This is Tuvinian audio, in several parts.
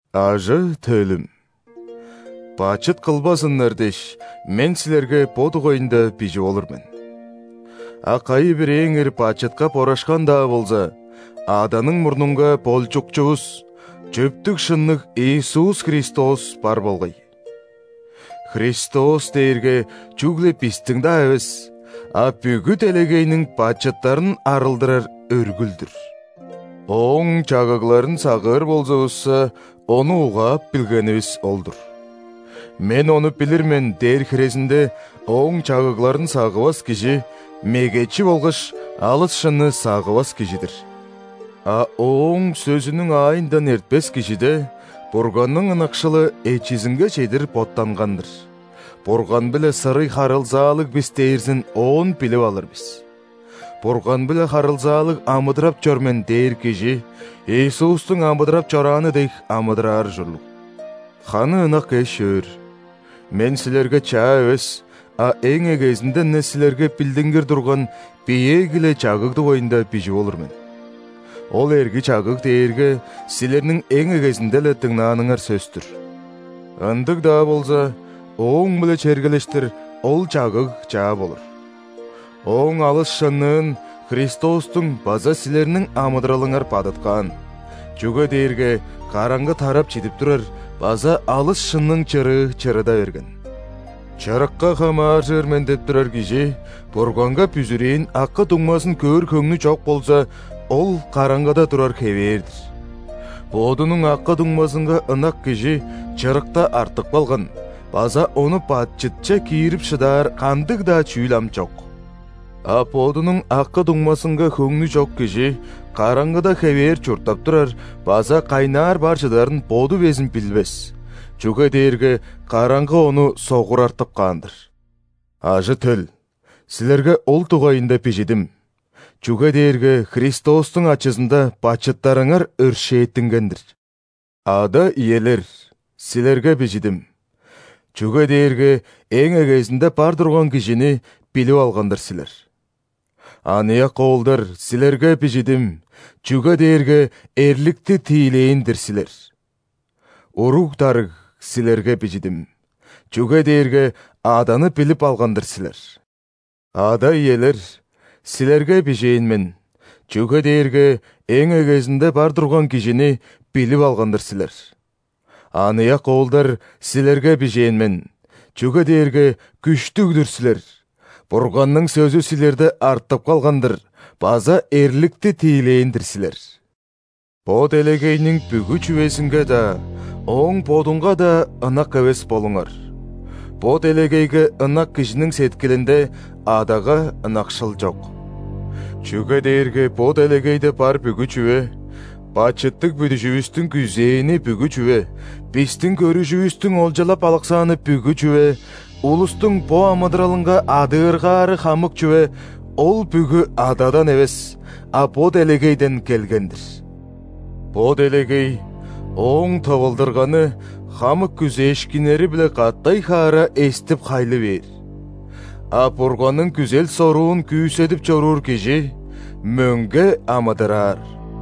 Ажы-төлүм! Бачыт кылбазыннар дээш, мен силерге бо дугайында бижип олур мен. А кайы-бирээңер бачытка борашкан-даа болза, Аданың мурнунга Болчукчувус, чөптүг-шынныг Иисус Христос бар болгай. Христос дээрге чүгле бистиң-даа эвес, а бүгү делегейниң бачыттарын арылдырар өргүл-дүр. Ооң чагыгларын сагыыр болзувусса, Ону угаап билгенивис ол-дур. «Мен Ону билир мен» дээр хирезинде, Ооң чагыгларын сагывас кижи – мегечи болгаш алыс шынны сагывас кижи-дир. А Ооң сөзүнүң аайындан эртпес кижиде Бурганның ынакшылы эчизинге чедир боттанган-дыр; Бурган-биле сырый харылзаалыг бис дээрзин оон билип алыр бис. «Бурган-биле харылзаалыг амыдырап чор мен» дээр кижи Иисустуң амыдырап чорааны дег амыдыраар ужурлуг. Ханы ынак эш-өөр, мен силерге чаа эвес, а эң эгезинден-не силерге билдингир турган биеэги-ле чагыг дугайында бижип олур мен. Ол эрги чагыг дээрге силерниң эң эгезинде-ле дыңнааныңар сөс-түр. Ындыг-даа болза, ооң-биле чергелештир ол чагыг чаа болур. Ооң алыс шынныын Христостуң база силерниң амыдыралыңар бадыткаан, чүге дээрге караңгы тарап чидип турар база алыс шынның чырыы чырыда берген. Чырыкка хамааржыр мен деп турар кижи Бурганга бүзүрээн акы-дуңмазын көөр хөңнү чок болза, ол караңгыда турар хевээр-дир. Бодунуң акы-дуңмазынга ынак кижи чырыкта артып калган база ону бачытче киирип шыдаар кандыг-даа чүүл ам чок. А бодунуң акы-дуңмазынга хөңнү чок кижи караңгыда хевээр чурттап турар база кайнаар бар чыдарын боду безин билбес, чүге дээрге караңгы ону согурартып каан-дыр. Ажы-төл, силерге ол дугайында бижидим,чүге дээрге Христостуң ачызында бачыттарыңар өршээттинген-дир. Ада-иелер, силерге бижидим,чүге дээрге эң эгезинде бар турган Кижини билип алган-дыр силер.Аныяк оолдар, силерге бижидим,чүге дээрге эрликти тиилээн-дир силер.Уруг-дарыг, силерге бижидим,чүге дээрге Аданы билип алган-дыр силер. Ада-иелер, силерге бижээн мен,чүге дээрге эң эгезинде бар турган Кижини билип алган-дыр силер.Аныяк оолдар, силерге бижээн мен,чүге дээрге күштүг-дүр силер,Бурганның сөзү силерде артып калган-дырбаза эрликти тиилээн-дир силер. Бо делегейниң бүгү чүвезинге-даа, ооң бодунга-даа ынак эвес болуңар: бо делегейге ынак кижиниң сеткилинде Адага ынакшыл чок. Чүге дээрге бо делегейде бар бүгү чүве, бачыттыг бүдүжүвүстүң күзээни бүгү чүве, бистиң көрүжүвүстүң олчалап алыксааны бүгү чүве, улустуң бо амыдыралынга адыыргаары хамык чүве – ол бүгү Ададан эвес, а бо делегейден келген-дир. Бо делегей ооң тывылдырганы хамык күзээшкиннери-биле катай-хаара эстип-хайлы бээр, а Бурганның күзел-соруун күүседип чоруур кижи мөңге амыдыраар.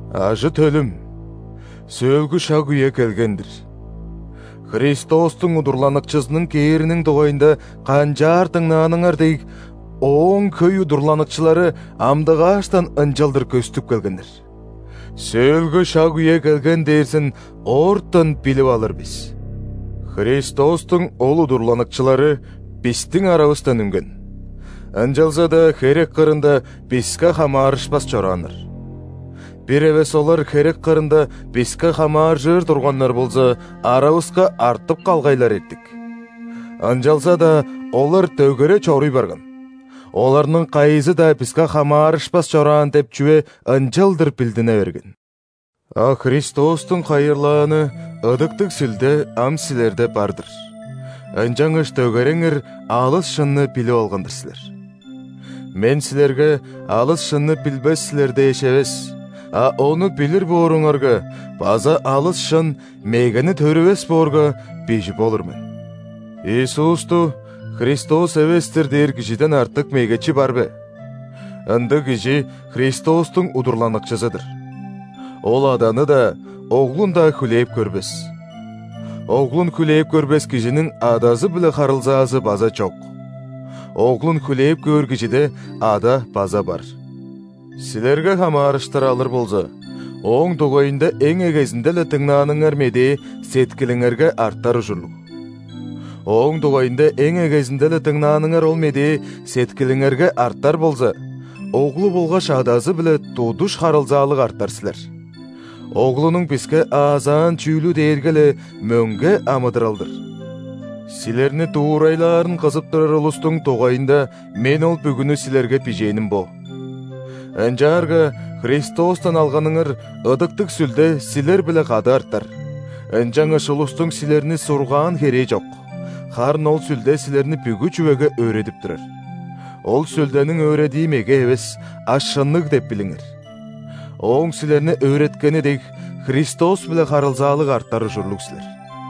Ажы-төлүм! Сөөлгү шаг-үе келген-дир. Христостуң удурланыкчызының кээриниң дугайында канчаар дыңнааныңар дег, Ооң хөй удурланыкчылары амдыгааштан ынчалдыр көстүп келгеннер. Сөөлгү шаг-үе келген дээрзин оортан билип алыр бис. Христостуң ол удурланыкчылары бистиң аравыстан үнген, ынчалза-даа херек кырында биске хамаарышпас чорааннар. Бир эвес олар херек кырында биске хамааржыр турганнар болза, аравыска артып калгайлар эртик. Ынчалза-даа олар дөгере чоруй барган, оларның кайызы-даа биске хамаарышпас чораан деп чүве ынчалдыр билдине берген. А Христостуң хайырлааны Ыдыктыг Сүлде ам силерде бар-дыр, ынчангаш дөгереңер алыс шынны билип алган-дыр силер. Мен силерге алыс шынны билбес силер дээш эвес, а ону билир бооруңарга база алыс шын мегени төрүвес боорга, бижип олур мен. Иисусту Христос эвес-тир дээр кижиден артык мегечи бар бе? Ындыг кижи – Христостуң удурланыкчызы-дыр. Ол Аданы-даа, Оглун-даа хүлээп көрбес. Оглун хүлээп көрбес кижиниң Адазы-биле харылзаазы база чок, Оглун хүлээп көөр кижиде Ада база бар. Силерге хамаарыштыр алыр болза, ооң дугайында эң эгезинде-ле дыңнааныңар медээ сеткилиңерге артар ужурлуг. Ооң дугайында эң эгезинде-ле дыңнааныңар ол медээ сеткилиңерге артар болза, Оглу болгаш Адазы-биле тудуш харылзаалыг артар силер. Оглунуң биске аазаан чүүлү дээрге-ле мөңге амыдырал-дыр. Силерни дуурайлаарын кызып турар улустуң дугайында мен ол бүгүнү силерге бижээним бо. Ынчаарга Христостан алганыңар Ыдыктыг Сүлде силер-биле кады артар, ынчангаш улустуң силерни сургаан херээ чок; харын ол Сүлде силерни бүгү чүвеге өөредип турар. (Ол Сүлдениң өөредии меге эвес, а шынныг деп билиңер.) Ооң силерни өөреткени дег, Христос-биле харылзаалыг артар ужурлуг силер.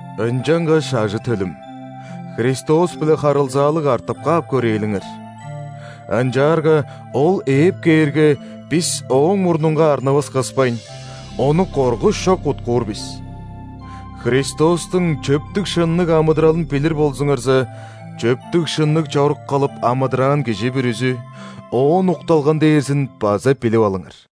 Ынчангаш ажы-төлүм, Христос-биле харылзаалыг артып каап көрээлиңер. Ынчаарга Ол ээп кээрге, бис Ооң мурнунга арнывыс кыспайн, Ону коргуш чок уткуур бис. Христостуң чөптүг-шынныг амыдыралын билир болзуңарза, чөптүг-шынныг чорук кылып амыдыраан кижи бүрүзү Оон укталган дээрзин база билип алыңар.